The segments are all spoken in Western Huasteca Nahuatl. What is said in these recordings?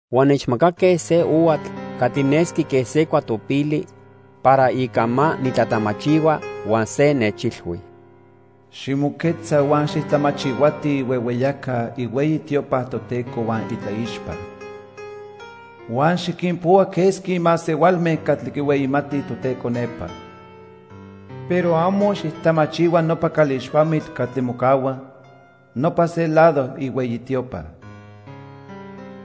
Huan nechmacaque se ohuatl catli nesqui quen se cuatopili para ica ma nitlatamachihua, huan se nechilhui: "Ximoquetza huan xijtlamachihuati ihuehueyaca ihueyi tiopa Toteco huan itlaixpa. Huan xiquinpohua quesqui masehualme catli quihueyimatij Toteco nepa. Pero amo xijtamachihua nopa calixpamitl catli mocahua nopa se lado ihueyi tiopa.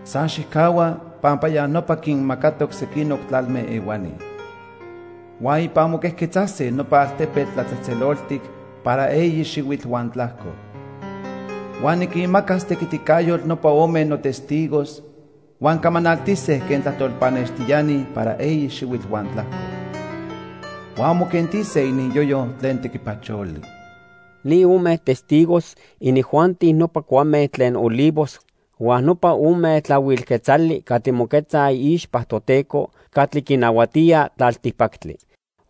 San xijcahua, pampa ya nopa quinmacatoc sequinoc tlalme ehuani. Huan ipan moquejquetzase nopa altepetl tlatzejtzeloltic para eyi xihuitl huan tlajco. Huan niquinmacas tequiticayotl nopa ome notestigos huan camanaltise quen tlajtol pannextiani para eyi xihuitl huan tlajco. Huan moquentise ininyoyo tlen tequipacholi." Ni ome testigos, inijuanti nopa cuame tlen olivos huan nopa ome tlahuil quetzali catli moquetzaj iixpa Toteco catli quinahuatía tlaltipactli.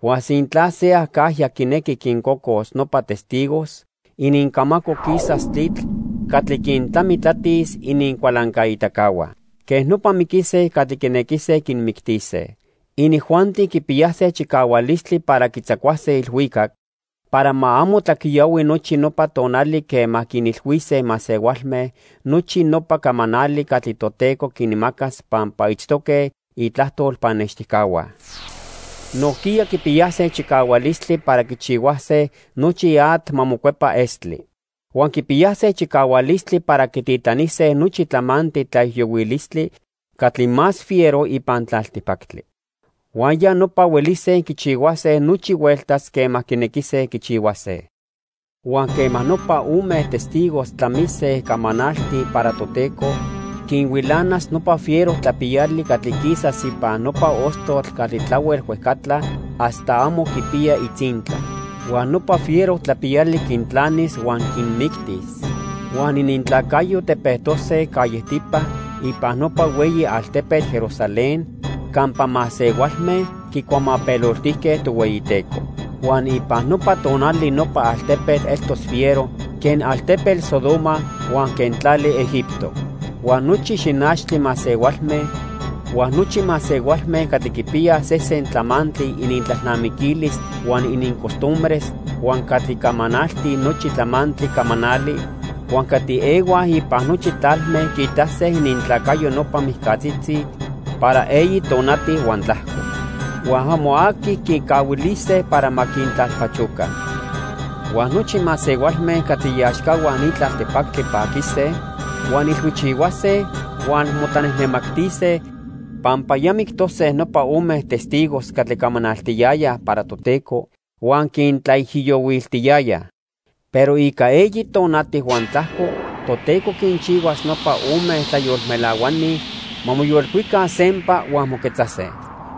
Huan sintla se acajya quinequi quincocos nopa testigos, inincamaco quisas tlitl catli quintlamitlatis inincualancaitacahua. Quej nopa miquise catli quinequise quinmictise. Inijuanti quipiyase chicahualistli para quitzacuase ilhuicac para ma amo tlaquiyahui nochi nopa tonali quema quinilhuise masehualme nochi nopa camanali catli Toteco quinmacas pampa itztoque itlajtol pannextijcahua. Nojquiya quipiyase chicahualistli para quichihuase nochi atl ma mocuepa estli. Huan quipiyase chicahualistli para quititlanise nochi tlamantli tlaijiyohuilistli catli más fiero ipan tlaltipactli. Huan ya nopa huelise quichihuase nochi hueltas quema quinequise quichihuase. Huan quema nopa ome testigos tlamise camanaltij para Toteco, quinhuilanas nopa fiero tlapiyali catli quisas ipan nopa ostotl catli tlahuel huejcatla hasta amo quipiya itzintla. Huan nopa fiero tlapiyali quintlanis huan quinmictis. Huan inintlacayo tepejtose callejtipa ipan nopa hueyi altepetl Jerusalén campa masehualme quicuamapeloltijque Tohueyiteco. Huan ipan nopa tonali nopa altepetl eltos fiero quen altepetl Sodoma huan quen tlali Egipto. Huan nochi xinachtli masehualme, huan nochi masehualme catli quipiyaj sesen tlamantli inintlalnamiquilis huan inincostumbres, huan catli camanaltij nochi tlamantli camanali, huan catli ehuaj ipan nochi tlalme quiitase inintlacayo nopa mijcatzitzi para eyi tonati huan tlajco. Huan amo aqui quicahuilise para ma quintlalpachoca. Huan nochi masehualme catli iaxcahua ni tlaltipactli paquise, huan ilhuichihuase huan motlanejnemactise, pampa ya mictose nopa ome testigos catli camanaltiyayaj para Toteco huan quintlaijiyohuiltiyayaj. Pero ica eyi tonati huan tlajco Toteco quinchihuas nopa ome tlayolmelahuani ma moyolcuica sempa huan moquetzase.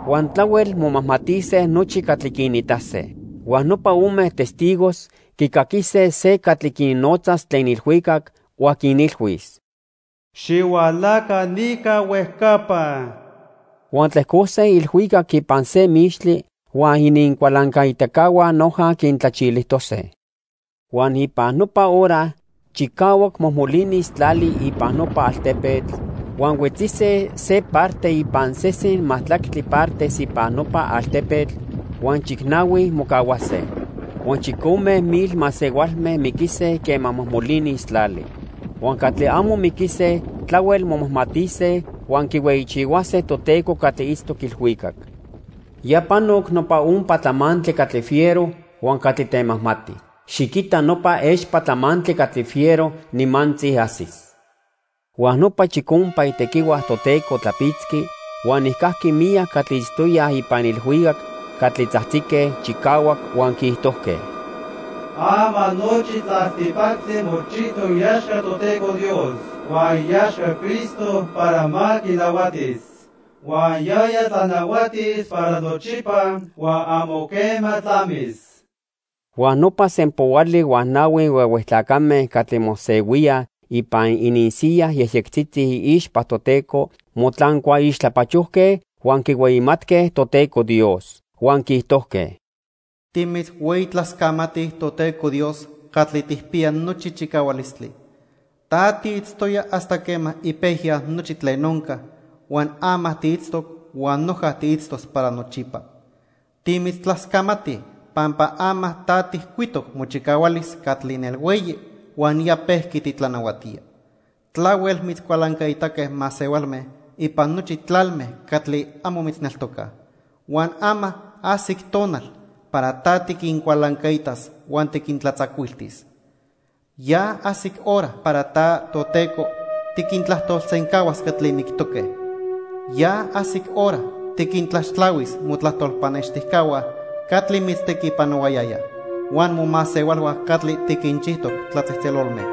Huan tlahuel momajmatise nochi catli quinitase. Huan nopa ome testigos quicaquise se catli quinnotzas tlen ilhuicac, huan quinilhuis: "Xihualaca nica huejcapa." Huan tlejcose ilhuicac ipan se mixtli, huan inincualancaitacahua noja quintlachilijtose. Huan ipan nopa hora chicahuac mojmolinis tlali ipan nopa altepetl huan huetzise se parte ipan sesen majtlactli partes ipan nopa altepetl huan chicnahui mocahuase. Huan chicome mil masehualme miquise quema mojmolinis tlali. Huan catli amo miquise tlahuel momajmatise huan quihueyichihuase Toteco catli itztoc ilhuicac. Ya panoc nopa ompa tlamantli catli fiero huan catli temajmati. Xiquita nopa expa tlamantli catli fiero nimantzi ajsis. Huan nopa chicompa itequihua Toteco tlapitzqui huan nijcajqui miyac catli itztoyaj ipan ilhuicac catli tzajtzique chicahuac, huan quiijtojque: "Ama nochi tlaltipactli mochijtoc iaxca Toteco Dios huan iaxca Cristo para ma quinahuatis. Huan yaya tlanahuatis para nochipa huan amo quema tlamis." Huan nopa sempoali huan nahui huehue tlacame catli mosehuíaj ipan ininsiyas yejyectzitzi iixpa Toteco motlancua ixtlapachojque huan quihueyimatque Toteco Dios. Huan quiijtojque: "Timitzhueyitlascamatij Toteco Dios catli tijpiya nochi chicahualistli. Ta tiitztoya hasta quema ipejya nochi tlen onca huan ama tiitztoc huan noja tiitztos para nochipa. Timitztlascamatij pampa ama ta tijcuitoc mochicahualis catli nelhueyi huan ya pejqui titlanahuatía. Tlahuel mitzcualancaitaque masehualme ipan nochi tlalme catli amo mitzneltocaj, huan ama ajsic tonal para ta tiquincualancaitas huan tiquintlatzacuiltis. Ya ajsic hora para ta, Toteco, tiquintlajtolsencahuas catli mictoque. Ya ajsic hora tiquintlaxtlahuis motlajtol pannextijcahua catli mitztequipanohuayayaj, huan momasehualhua catli tiquinchijtoc tlatzejtzelolme.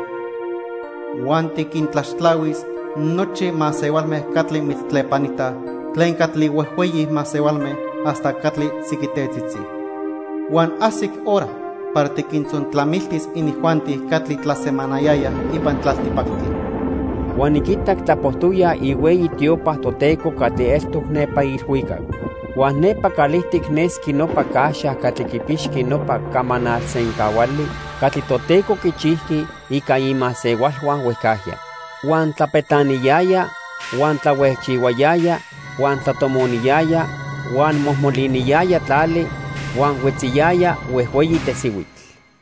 Huan tiquintlaxtlahuis nochi masehualme catli mitztlepanitaj tlen catli huejhueyi masehualme hasta catli tziquitetzitzi. Huan ajsic hora para tiquintzontlamiltis inijuanti catli tlasemanayayaj ipan tlaltipactli." Huan niquitac tlapojtoya ihueyi tiopa Toteco catli eltoc nepa ilhuicac. Huan nepa calijtic nesqui nopa caxa catli quipixqui nopa camanal sencahuali catli Toteco quichijqui ica imasehualhua huejcajya. Huan tlapetlaniyaya, huan tlahuejchihuayaya, huan tlatomoniyaya, huan mojmoliniyaya tlali, huan huetziyaya huejhueyi tesihuitl.